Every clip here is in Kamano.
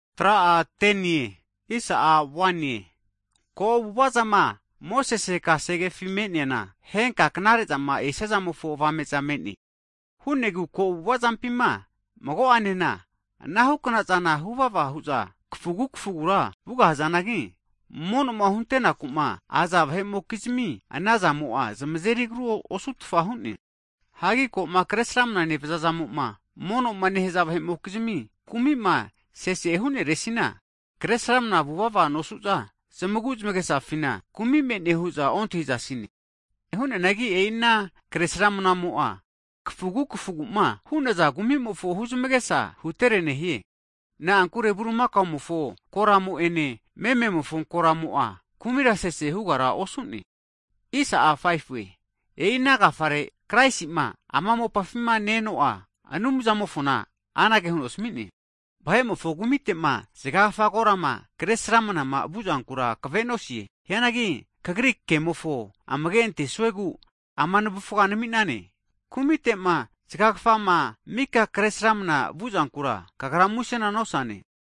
Hagi ko avu'avazama Mosese kasegefima me'neana henka knare'zama esiazamofo avame'za me'ne. Hu'negu ko avu'avazampima mago'anena anahukna zana huvava hu'za kafugu kafugura vugahazanagi, mono'ma huntenaku'ma haza vahe'mokizmi, ana zamo'a zamazeri agru osutfa hu'ne. Hagi koma kresramna nevaza'zamo'ma mono'ma nehaza vahe'mokizmi kumi'ma sese hu'neresina, kresramna vuvava nosu'za, zamagu zamagesafina kumi me'ne hu'za ontahizasine. Hu'neanagi e'i ana kresramnamo'a kafugu kafuguma hu'naza kumimofo huzmagesa hutere nehie. Na'ankure bulimakaomofo koramo ene mememofo koramo'a kumira sese hugara osu'ne. E'i ana agafare Kraisima ama mopafima ne-eno'a Anumzamofona anage huno asami'ne, Vahe'mofo kumitema zagagafa korama Kresramanama vuzankura kavenosie. Hianagi Kagri kemofo amage antesuegu ama navufga nami'nane. Kumitema zaga kfama mika Kresramana vuzankura, Kagra musena nosane.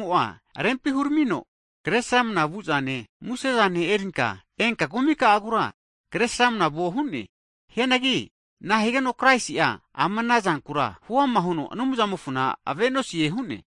Kasegemo'a rempi huramino, kresramna vu'zane musezane erinka enka kumika'agura kresramnavuo hu'ne. Hianagi nahigeno Kraisi'a ama ana zankura huama huno Anumzamofona avenosie hu'ne?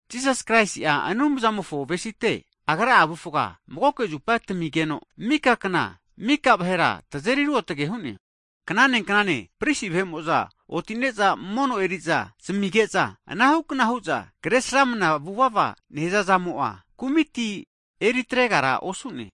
Jisas Kraisi'a Anumzamofo avesite Agra'a avufga magoke zupa tamigeno mika kna, mika vahera tazeri ruotge hu'ne. Hagi knane knanena pristi vahe'mo'za otine'za mono eri'za zamige'za ana hukna hu'za kre sramana vuvava nehazazamo'a kumiti eritregara osu'ne.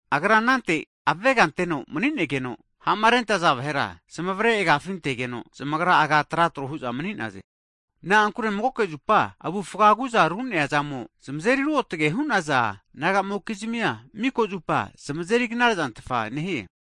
Agra anante avega anteno mani'negeno, Ha'marenentaza vahera zamavre agafi antegeno, zamagra agama ante tra trohu'za mani'naze. Na'ankure magoke zupa avufga agu'za ru'nea zamo, zamazeri ruotge hu'naza nagamokizmia, miko zupa zamazeri knare'zantfa nehie.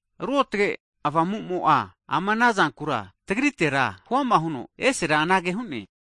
Ruotge Avamumo'a ama ana zankura tagritera huama huno esera anage hu'ne,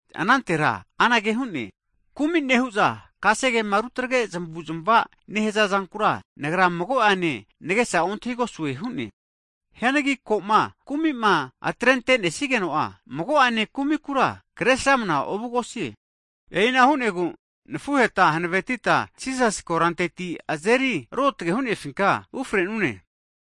Anantera anage hu'ne, Kumi nehu'za kasegema rutagre zamavuzmava nehaza zankura, Nagra mago'ene nagesa ontahigosue hu'ne. Hagi ko'ma kumi'ma atrentenesigeno'a, mago'ane kumikura kresramna ovugosie. E'ina hu'negu nafuheta hanavetita Jisasi koranteti azeri Ruotge hu'nefinka ufrenune.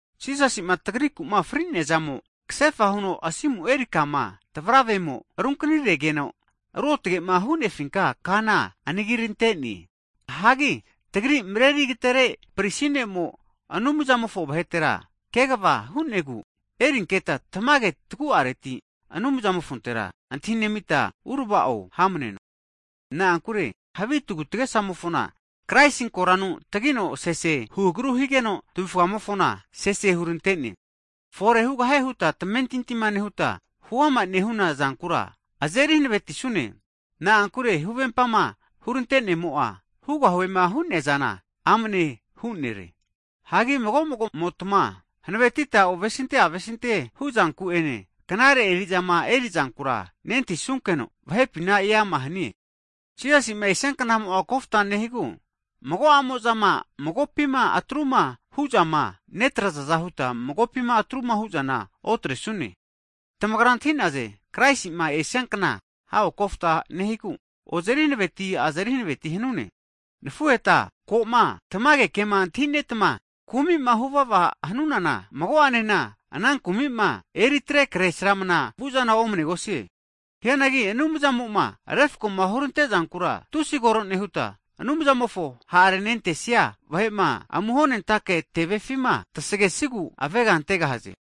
Jisasima tagriku'ma fri'neazamo, kasefa huno asimu eri kama tavravemo runkaniregeno, Ruotgema hu'nefinka kana anagirante'ne. Hagi tagri'ma Mareri Agatere Pristi Ne'mo, Anumzamofo vahetera kegava hu'negu, erinketa tamage tagu'areti Anumzamofontera antahinemita urava'o hamneno. Na'ankure havi tagutagesamofona, Kraisi koranu tagino sesehu agru higeno tavufgamofona sese hurantene. Fore hugahie huta tamentinti nehuta huama nehuna zana azeri hanavetisune. Na'ankure huvempama hurantenemo'a hugahuema hu'neazana amanehu nere. Hagi mago magomotma hanavetita ovesinte avesinte huzanku'ene, knare eri'zama erizankura nentahisunkeno, vahepina eama hanie. Jisasi'ma esia knamo'a kofta nehigu, mago'amo'zama magopima atruma hu'zama netrazaza huta, magopima atruma hu'zana otresune. Tamagra antahinaze, Kraisi'ma esiakna hago kofta nehigu, ozeri hanaveti azeri hanaveti hanune. Hagi nafuheta ko'ma tamage kema antahinetama, kumi'ma huvava hanunana, mago'anena ana kumi'ma eriatre kre sramana vu'zana omnegosie. Hianagi Anumzamo'ma refkoma hurante zankura tusi kore nehuta, Anumzamofo ha'renentesia vahe'ma amuhonentake tevefima tasegesagu avega antegahaze.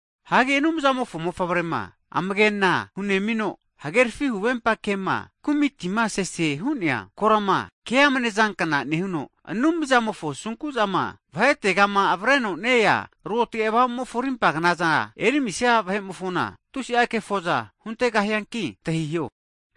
Hagi, Anumzamofo Mofavrema amagena hunemino, hagerafi huvempa kema kumitima sese hu'nea korama ke'amne zankna nehuno, Anumzamofo asunku'zama vahetegama avreno ne-ea Ruotage Avamumofo arimpa knaza erimisia vahe'mofona, tusi'a kefo'za huntegahianki antahiho.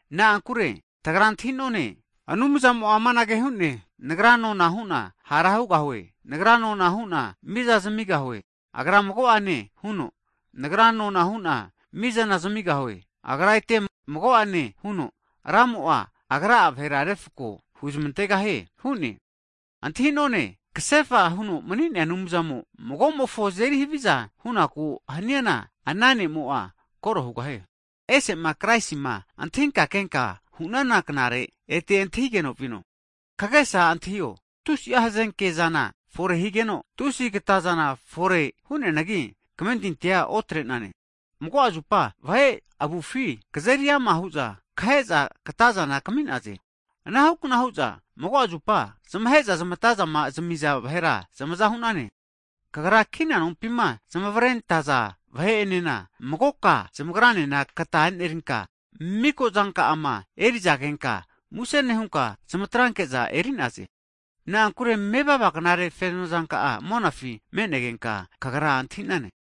Na'ankure tagra antahi'none, Anumzamo'a amanage hu'ne, Nagra nona hu'na hara hugahue. Nagra nona huna mizana zamigahue. Agra mago'ane hune, Nagra nona hu'na mizana zamigahue. Agra ete mago'ane hune, Ramo Agra'a vahera refko huzmantegahie hu'ne. Antahi'none, kasefa huno mani'nea Anumzamo magomofo azeri haviza hu'naku haniana, ana ne'mo'a koro hugahie. Ese'ma Kraisima antahinka kenka hunana knare ete antahigeno vino. Kagesa antahio, tusi'a hazenke zana fore higeno, tusi katazana fore hu'neanagi kamentintia otre'nane. Mago'a zupa vahe avufi kazeri ama hu'za kaheza katazana kami'naze. Anahukna hu'za mago'a zupa zamahe'za zamatama zamiza vahera zamaza hu'nane. Kagra kina nompima zamavarentaza vahe'enena magoka zamagranena katazana enerinka, miko zanka'ama erizagenka muse nehunka, zamatranke'za e'nerize. Na'ankure mevava knare fenozanka'a monafi me'negenka kagra antahi'nane.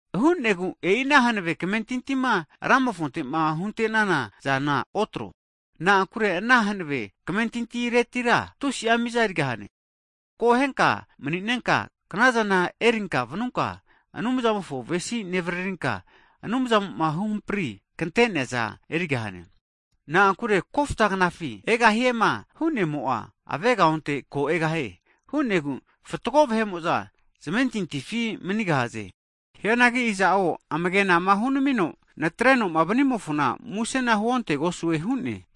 Hu'negu e'i ana hanave kamentintima Ramofontema hunte'nana zana otro. Na'ankure ana hanave kamentintiretira tusi'a miza erigahane. Akohenka mani'nenka knazana erinka vanunka, Anumzamofo avesi nevaririnka, Anumzamo'ma huhampri kante'nea zana erigahane. Na'ankure kofta knafi Egahiema hu'nemo'a avegaonte, ko egahie. Hu'negu fatgo vahe'mo'za zamentintifi manigahaze. Hianagi iza'o amagenama hunamino natre'noma vanimofona musena huontegosue hu'ne.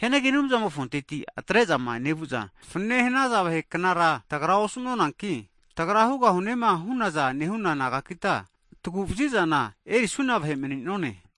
Hianagi Anumzamofonteti atre'zama nevu'za fanane hanaza vaheknara tagra osanunanki, tagra hugahunema hu'naza nehuna nagakita, taguvaziza erisuna vahe mani'none.